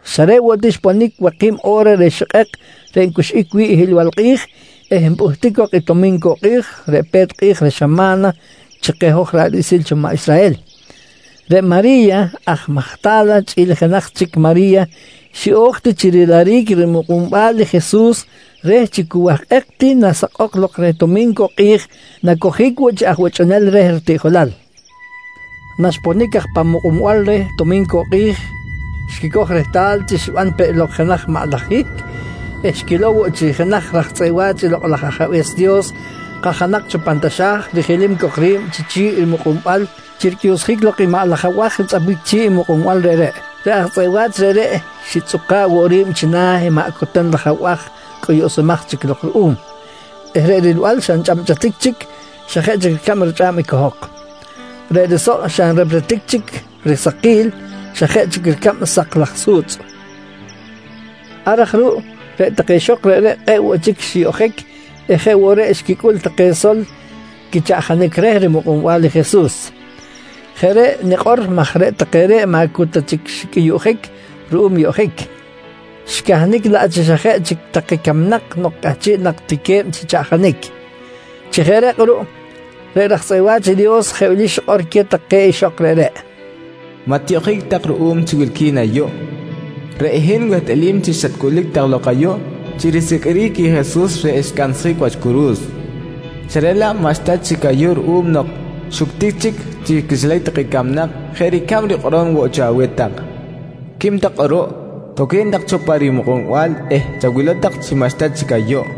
Xa reꞌ woꞌ ti xponic waki̱b o̱ra reh xikꞌek reꞌ ncuxꞌic wi̱ꞌ i hiꞌlbal kꞌi̱j eh npꞌuhtic cok i tomincuꞌ kꞌi̱j reꞌ pe̱t kꞌi̱j reh xama̱na chi keh hoj ra̱ꞌ riꞌsil cho maꞌ Israhel, reꞌ Mari̱ya aj Majta̱la chꞌi̱l i jenaj chic Mari̱ya xiꞌo̱j ti chi riliric rimukꞌunbal i Jesus reh chi cu wahkꞌek ti nasakꞌok lok reh Tomincuꞌ kꞌi̱j nacojic woꞌ chi aj buchꞌunel reh ritiꞌjolal. Naxiponic aj pan mukꞌunbal reh tomincuꞌ kꞌi̱j, xquicoj rehtal chi xiban peꞌ lok jenaj maꞌ laj hihc eh xquilow woꞌ chi jenaj raj tzꞌeꞌ wa̱ch i Lokꞌ laj Ajabe̱s Dios kajanak cho pan taxa̱j rijilim cok ri̱b chi chi̱ꞌ i mukꞌunbal chi ricꞌuyuꞌsjic lok i maꞌ laj abaj ntzꞌapbic chi̱ꞌ i mukꞌunbal reꞌreꞌ. Reꞌ aj tzꞌeꞌ wa̱ch reꞌreꞌ xitzꞌuka̱ꞌ woꞌ ri̱b china̱ i maꞌ coten laj abaj cꞌuyuꞌsumaj chi lok ruꞌum eh reꞌ rilbal xa nchꞌabchꞌatic chic xa jeꞌ chic ricab richꞌa̱b i cohok. Reꞌ risoꞌ xa nrepretic chic risakil, xa jeꞌ chic ricab sak laj su̱tzꞌ. Ar aj ruꞌ reꞌ take ixok reꞌreꞌ kꞌe̱ꞌ woꞌ chic xiyoꞌjic eh jeꞌ woꞌ reꞌ xquicꞌul take sol quichaꞌjanic reh rimukꞌunbal i Jesus. Jeꞌ reꞌ nikꞌor maj reꞌ take reꞌ maꞌ cu ta chic xicꞌuyuꞌjic ruꞌum yoꞌjic, xicahnic laꞌ chi xa jeꞌ chic take camnak nok cꞌahchiꞌ nak ti que̱b chi chaꞌjanic. Chi jeꞌ reꞌ kꞌuruꞌ, reꞌ raj tzꞌeꞌ wa̱ch i Dios jeꞌ wili xikꞌor queh take ixok reꞌreꞌ: «Maꞌ tiyoꞌjic tak ruꞌum chi wilqui̱n ayuꞌ. Reꞌ hin wehtꞌalim chi xatcꞌulic tak lok ayuꞌ chi risiqꞌuiric i Jesus reꞌ xcansjic wach curu̱s, xa reꞌ laꞌ maꞌxta chic ayuꞌ ruꞌum nok xuctic chic chi quixilac take camnak jeꞌ ricab rikꞌorom woꞌ cho aweh tak. Quim tak kꞌuruꞌ, toque̱n tak cho pa rimukꞌunbal eh chawilow tak chi maꞌxta chic ayuꞌ.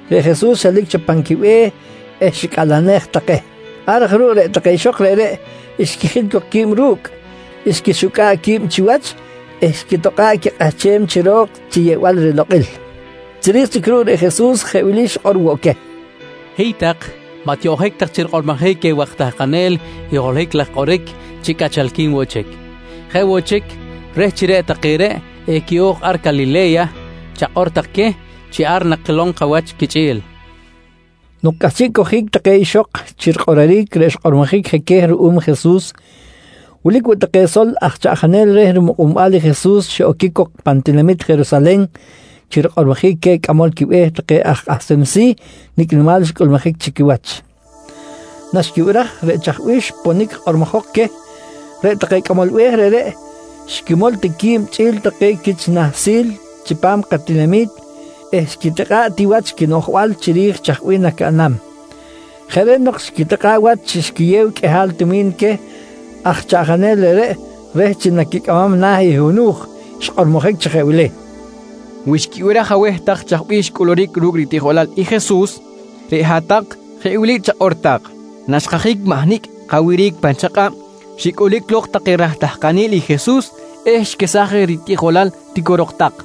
reꞌ Jesus xelic cho pan quibe̱h eh xicꞌalenej take. Ar aj ruꞌ reꞌ take ixok reꞌreꞌ xquijil cok qui̱b ru̱cꞌ, xquixucꞌa̱ꞌ qui̱b chiwach eh xquitokꞌa̱ꞌ quikꞌahchem chi ro̱k chi yeꞌbal rilokꞌil. Chiri̱j chic ruꞌ reꞌ Jesus jeꞌ wili xikꞌor woꞌ queh: «Hiy tak, maꞌ tiyoꞌjic tak chi rikꞌormojic queh waj tahkanel i holohic laj kꞌoric chi cꞌachalqui̱n woꞌ chic. Jeꞌ woꞌ chic, reh chi reꞌ take reꞌ equiꞌo̱j ar Calile̱ya, chakꞌor tak queh chi ar nakilom kawach quichꞌi̱l, nqui Jesus queh. Nok cꞌahchiꞌ cojic take ixok chi rikꞌororic reꞌ xkꞌormojic je queh ruꞌum Jesus, wilic woꞌ take sol aj chaꞌjanel reh rimukꞌunbal i Jesus xiꞌoquic cok pan tinamit Jerusalen chi rikꞌormojic queh cꞌamol quibe̱h take aj kꞌahsem si̱ nicꞌ nimal xcꞌulmujic chi quiwach. Naxquibiraj reꞌ chaj bih xponic kꞌormojok queh, reꞌ take cꞌamol be̱h reꞌreꞌ xquimol ti qui̱b chꞌi̱l take quich nahsil chipam katinami̱t eh xquitikꞌa̱ꞌ ti wach quinoꞌjbal chiri̱j chaj bih nacaꞌnam. Jeꞌ reꞌ nok xquitikꞌa̱ꞌ wach chi xquiyew qꞌuihal tumi̱n queh aj chaꞌjanel reꞌreꞌ reh chi naquicꞌamam na̱ i hunu̱j xkꞌormojic chi jeꞌ wili: «Wi xquibiraj aweh tak chaj bih xcꞌuluric ru̱cꞌ ritiꞌjolal i Jesus, reꞌ hat-tak jeꞌ wili chakꞌor tak: ‹Naxkajic mahnicꞌ kawiric pan chakꞌab, xicꞌulic lok take raj tahkanel i Jesus eh xquesaj je ritiꞌjolal, tiquirok tak.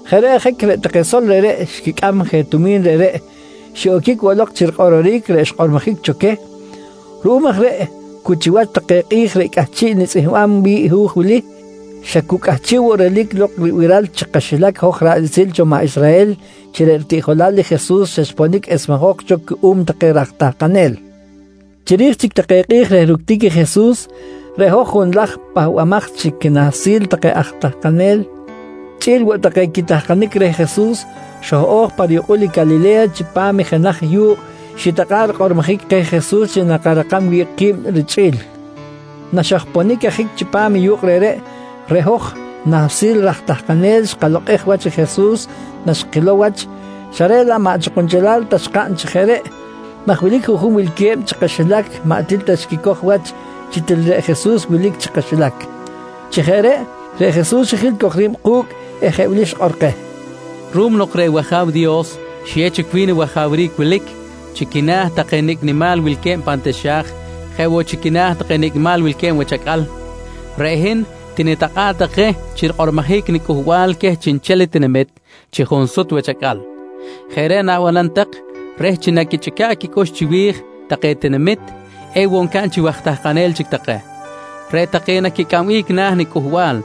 Jeꞌ reꞌ ajic reꞌ take sol reꞌreꞌ xquicꞌam je tumi̱n reꞌreꞌ, xiꞌoquic woꞌ lok chi rikꞌororic reꞌ xkꞌormojic cho queh. Ruꞌum aj reꞌ cu chiwach take kꞌi̱j reꞌ cꞌahchiꞌ nitzꞌihmbam wi̱ꞌ i hu̱j wili, xa cu cꞌahchiꞌ woꞌ relic lok ribiral chi kaxilac hoj ra̱ꞌ riꞌsil cho maꞌ Israhel chi reꞌ ritiꞌjolal i Jesus xa xponic esmejok cho cuꞌum take raj tahkanel. Chiri̱j chic take kꞌi̱j reh ructic i Jesus, reꞌ hoj junlaj pahbamaj chi quinahsil take aj tahkanel chꞌi̱l woꞌ take quitahkanic reh Jesus xoj-o̱j pa riyukꞌul i Calile̱ya chipam i jenaj yu̱kꞌ xitakꞌa̱ꞌ rikꞌormojic keh Jesus chi nakarakam wi̱ꞌ ki̱b richꞌi̱l. Naxojponic ajic chipam i yu̱kꞌ reꞌreꞌ, reꞌ hoj nahsil raj tahkanel xkalokꞌej wach i Jesus naxkilow wach, xa reꞌ laꞌ maꞌ chi kunchelal ta xcaꞌn chi jeꞌ reꞌ, maj wilic juꞌjun wilque̱b chi kaxilac maꞌ til ta xquicoj wach chi til reꞌ Jesus wilic chi kaxilac. Chi jeꞌ reꞌ, reꞌ Jesus xijil cok ri̱b ku̱cꞌ eh jeꞌ wili xikꞌor keh: «Ruꞌum nok reꞌ wAja̱w Dios xiyew chic wi̱n i wajawric wilic chi quina̱ take nicꞌ nimal wilque̱b pan taxa̱j jeꞌ woꞌ chi quina̱ take nicꞌ nimal wilque̱b wach acꞌal, reꞌ hin tinitakꞌa̱ꞌ tak je chi rikꞌormojic niCꞌuhbal queh chiꞌnchel i tinamit chi junsut wach acꞌal. Jeꞌ reꞌ na̱banam tak reh chi naquichꞌica̱ꞌ quicꞌux chiwi̱j take tinamit, ewoꞌ ncaꞌn chi waj tahkanel chic take. Reꞌ take naquicꞌambic na̱ niCꞌuhbal,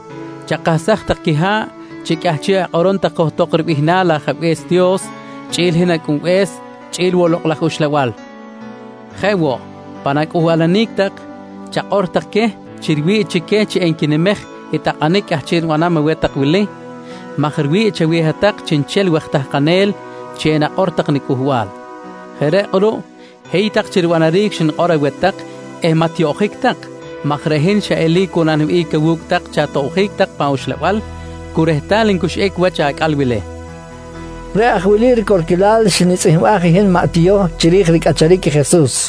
chakahsaj tak quiha̱ꞌ chi cꞌahchiꞌ akꞌorom tak johtok ribihnal i Ajabe̱s Dios, chꞌi̱l hin Acꞌunbe̱s chꞌi̱l woꞌ Lokꞌ laj Uxlabal. Jeꞌ woꞌ, pan acꞌuhbalanic tak chakꞌor tak queh chi riwi̱ꞌ chi queh chi enquinimej i takꞌanic cꞌahchiꞌ nibanam aweh tak wili maj riwi̱ꞌ chaweh hat-tak chiꞌnchel waj tahkanel chi enakꞌor tak niCꞌuhbal. Jeꞌ reꞌ kꞌuruꞌ, hiy tak chi ribanaric xnikꞌor aweh tak eh maꞌ tiyoꞌjic tak maj reꞌ hin xa eli̱c woꞌ naniwihꞌic awu̱cꞌ tak chi atobjic tak pan uxlabal cu rehtal ncuxꞌic wach acꞌal wili, nqui Jesus keh. Reꞌ aj i wili ricorquilal xnitzꞌihmbaj i hin maꞌ Tiyoh chiri̱j ricꞌacharic i Jesus.